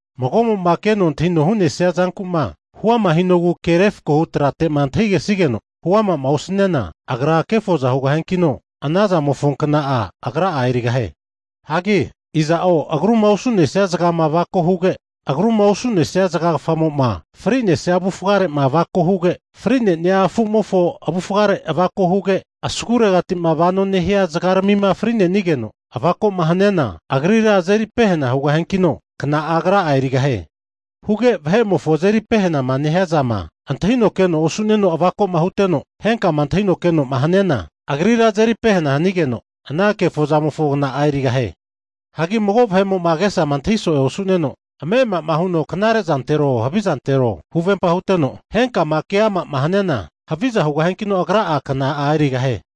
Mago'mo'ma keno antahino hu'nesia zanku'ma huama hinogu ke refako hu trateti'ma antahigesigeno huama'ma osaniana, agra kefoza hugahiankino, anazamofo kna'a agra'a erigahie. Hagi iza'o agruma osu'nesia zagama avako huge, agruma osu'nesia zagagafamo'ma fri'nesia avufgare'ma avako huge, fri'nenia afu'mofo avufgare avako huge, asguregatima regraroheno vanoma nehania zagaramima fri'nenigeno avako'ma haniana, agrira azeri pehena hugahiankino, kna'a agra'a erigahie. Huge vahe'mofo azeri pehenama nehiazama antahino keno osu'neno avako'ma huteno, henkama antahino keno'ma haniana, agrira azeri pehena hanigeno, ana kefozamofo kna'a erigahie. Hagi mago vahe'mo'ma agesa antahi so'e osu'neno, ame'ama huno knare'zantero havizantero huvempama huteno, henkama ke'amama haniana, haviza hugahiankino, agra'a kna'a erigahie.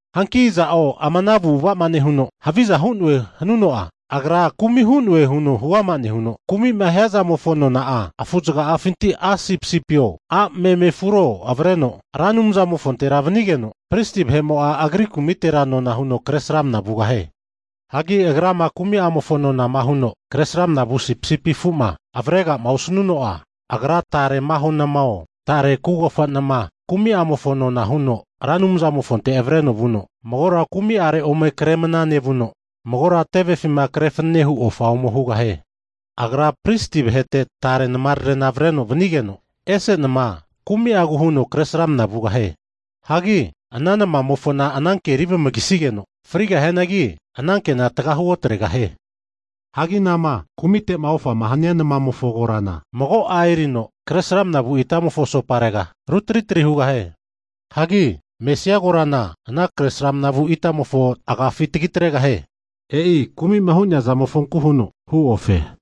Hanki iza'o ama ana avu'ava'ma nehuno haviza hu'noe hanuno'a, agra kumi hu'noe huno huama nehuno, kumi'ma hia zamofo nona'a, afuzaga'afinti a' sipisipio, a' meme afuro avreno Ra Anumzamofontera vanigeno, pristi vahe'mo'a agri kumitera nona huno kresramna vugahie. Hagi agrama kumi'amofo nonama huno kresramna vu sipisipi afu'ma avrega'ma osanuno'a, agra tare maho namao, tare kugofa nama kumi'amofo nona huno Ra Anumzamofonte avreno vuno magora kumi'are ome Kresramana nevuno, magora tevefima krefanene hu ofa ome hugahie. Agra pristi vahete tare namararena avreno vanigeno, ese nama kumi'agu huno kresramna vugahie. Hagi ana namamofona ananke erivamagasigeno frigahianagi, anankena tgahu otregahie. Hagi anama kumite'ma ofama hania namamofo korana, mago'a erino kresramana vu itamofo asoparega, rutri tri hugahie. Hagi mesia korana ana kresramna vu itamofo agafi tagitregahie. E'i kumi'ma hu'nea zamofonku huno hu ofe.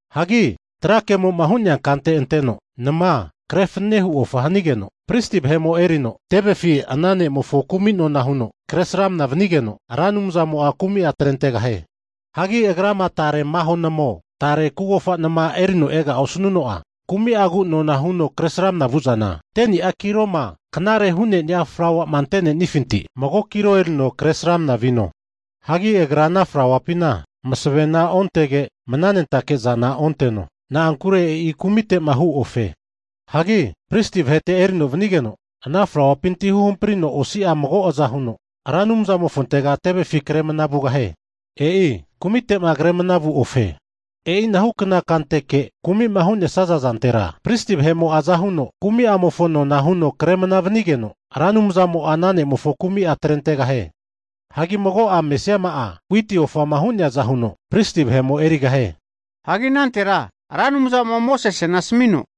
Hagi tra kemo'ma hu'nea kante anteno, mago nama kre fananehu ofa hanigeno, pristi vahe'mo erino tevefi ana ne'mofo kumi nona huno, kresramna vanigeno Ra Anumzamo'a kumi'a atrentegahie. Hagi agrama tare maho namao, tare kugofa nama erino ega'ma osnuno'a, kumi'agu nona huno kresramna vu'zana, 10ni'a kiloma knare hu'nenia flauama ante'nenifintira, mago kilo erino kresramna vino. Hagi agra ana flauapina masavena ontege, mnanentake'zana onteno. Na'ankure e'i kumite'ma hu ofe. Hagi pristi vahete erino vanigeno, ana flauapinti huhamprino osi'a mago aza huno Ra Anumzamofontega tevefi kre mana vugahie. E'i kumite'ma kremana vu ofe. E'inahukna kanteke kumi'ma hu'nesia zantera, pristi vahe'mo'a azahuno kumi'amofo nona huno kre mnana vanigeno, Ra Anumzamo'a ana ne'mofo kumi'a atrentegahie. Hagi mago'a mesiama'a, witi ofama hu'neaza huno pristi vahe'mo erigahie. Hagi anantera Ra Anumzamo'a Mosesena asmino,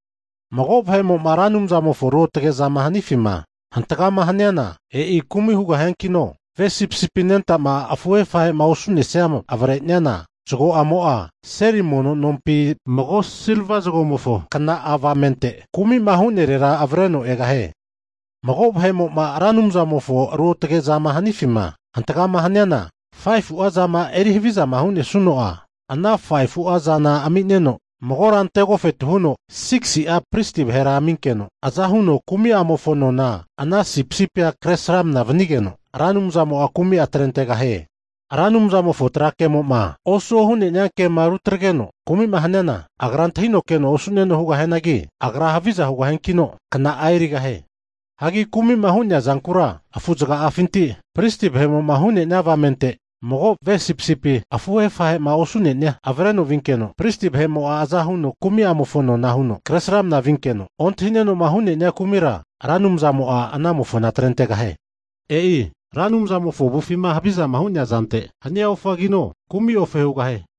Mago vahe'mo'ma Ra Anumzamofo ruotage zama hanifima hantagama haniana, e'i kumi hugahiankino, ve sipisipi anentama afuhe afahe'ma osu'nesia avreniana, zago'amo'a seli mono nompi mago silva zagomofo kna'a avamente kumi'ma hu'nerera avreno egahie. Mago vahe'mo'ma Ra Anumzamofonte'ma ruotage'ma hu'nea zama hanifima hantagama haniana, 5fu'a zama eri havizama hu'nesuno'a, ana 5fu'a zana ami'neno, magora ante agofetu huno 6si'a pristi vahera aminkeno, azahuno kumi'amofo nona ana sipisipia kresramana vanigeno, Ra Anumzamo'a kumi'a atrentegahie. Ra Anumzamofo tra kemo'ma osuo hu'nenia kema rutrageno kumi'ma haniana, agra antahino keno osu'neno hugahianagi, agra haviza hugahiankino, kna'a erigahie. Hagi kumi'ma hu'nea zankura afu zaga'afinti pristi vahe'mo'ma hu'nenia avamente mago ve sipisipia afuhe afahe'ma osu'nenia avreno vinkeno, pristi vahe'mo'a aza huno kumi'amofo nona huno kresramna vinkino, ontahinenoma hu'nenia kumira, Ra Anumzamo'a anamofona atrentegahie. E'i Ra Anumzamofo avufima havizama hu'nea zante hania ofagino, kumi ofa hugahie.